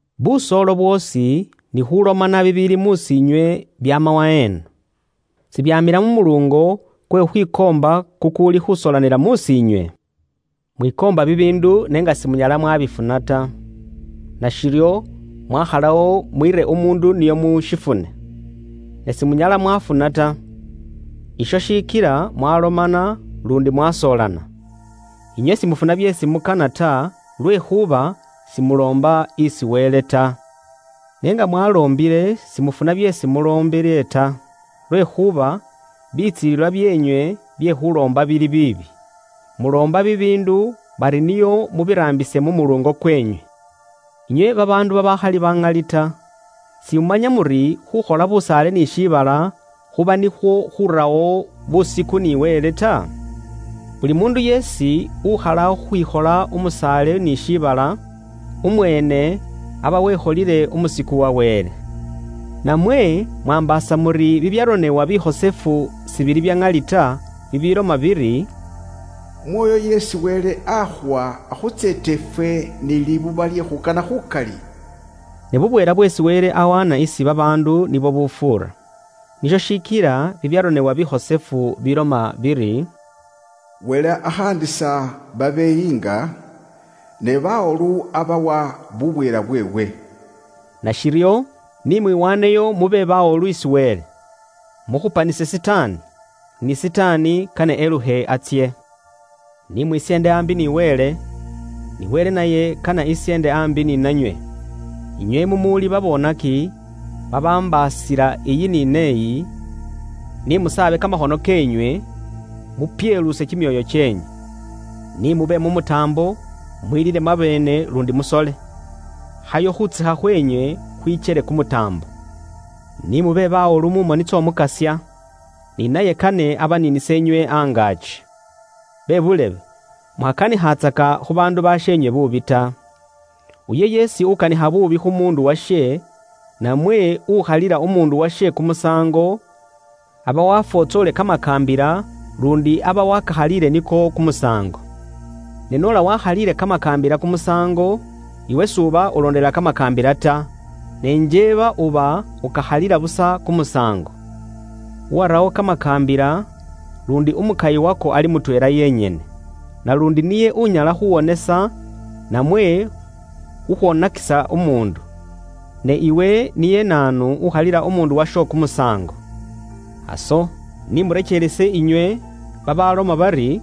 Busoolo bwoosi ni khuulomana bibiili mus'iinywe, byaama waheena? Sibyaamila mu muluungo kwe khukhwikoomba kukuuli khuusoolanila mus'iinywe? Mwikoomba bibiindu n'enga simunyala mwabifuna ta. Nashiryo mwakhalawo mwiire umuundu nio mushifune, ne simunyala mwafuna ta. Isho shikila mwalomana luundi mwasoolana. Inywe simufuna byeesi mukana ta, lwekhuuba simuloomba isi Wele ta. Ne nga mwaloombile simufuna byeesi muloombile ta, lwekhuuba bitsilililwa byeenywe bye khuuloomba bili biibi. Muloomba bibiindu bari nio mubiraambise mu muluungo kweenywe. Inywe babaandu babaakhali baŋali ta, simumanya muri khukhola busaale ni shiibala khuba nikhwo khurawo busiku ni Wele ta? Buli muundu yeesi ukhalawo khukhwikhola umusaale ni shiibala, umweene aba wekholile umusiku wa Wele. Namwe mwaambaasa muri bibyaronebwa bikhosefu sibili bya ŋali ta, bibiiloma biri: “Umwoyo isi Wele akhuwa akhutseeta ifwe ni libuba lye khuukana khuukali?” Ne bubweela bweesi Wele ahaana isi babaandu nibwo bubufuura. Nisho shikila bibyaronebwa bikhosefu biloma biri, “Wele akhaandisa babeyiinga, ne bawolu abawa bubweela bweewe.” Nashiryo, ni mwiwaaneyo mube bawolu isi Wele. Mukhupanise Sitaani, ni Sitaani kane elukhe atsye. Ni mwisyeende aambi ni Wele, ni Wele naye kane esyeende aambi ni nanywe. Inywe mumuuli baboonaki babambaasila eyi ni neeyi, ni musaabe kamakhono keenywe, mupyeluuse kimyoyo kyeenywe. Ni mube mu mutaambo, mwilile mwabeene, luundi musole. Khayo khuutsekha khweenywe khwikyele kumutaambo. Ni mube bawolu mu moni ts'Omukasya, ni naye kane abaniinise inywe angaaki. Bebuulebe, mukhakanikhatsaka khu baandu basheenywe buubi ta. Uyo yeesi ukanikha buubi khu muundu washe, namwe ukhalila umuundu washe kumusaango, aba wafwotsoolile kamakaambila luundi aba wakakhaliile niko kumusaango. Ne noola ukhalila kamakaambila kumusaango, iwe s'uba ulondelela kamakaambila ta, ne njeeba uba ukakhalila busa kumusaango. Uwarawo kamakaambila, luundi umukayi wako ali mutweela yenyene, naluundi niye unyala khuwonesa namwe khukhwonakisa umuundu. Ne iwe niye naanu ukhalila umuundu washo kumusaango? Aso, ni murekeerese inywe babaaloma bari,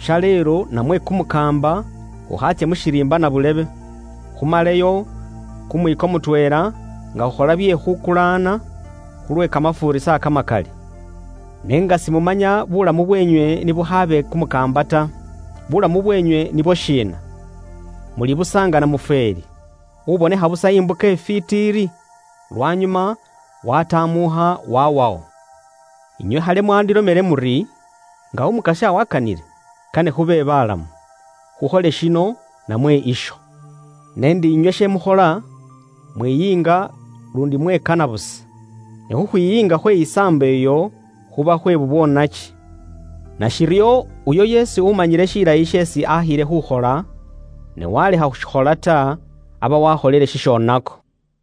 “Shaleelo namwe kumukaamba, khukhaatsye mu shiriimba nabuulebe, khumaleyo kumwiiko mutweela, nga khukhola bye khukulaana, khulwe kamafuurisa kamakali.” N'enga simumanya buulamu bweenywe ni bukhaabe kumukaamba ta. Bulamu bweenywe nibwo shiina? Muli busa nga namufweeli, ubonekha busa imbuka ifwiiti iri, lwanyuma waatamuukha waawawo. Inywe khali mwaandilomele muri, “Nga Umukasya waakanile, kane khube baalamu, khukhole shino namwe isho.” N'endi inywe she mukhola, mwiyiinga luundi mwekana busa. Ne khukhwiyiinga khwe saambo iyo khuba khwe bubwoonaki. Nashiryo, uyo yeesi umanyile shilayi sheesi akhiile khuukhola, ne waalekha khushikhola ta, aba waakholile shishoonako.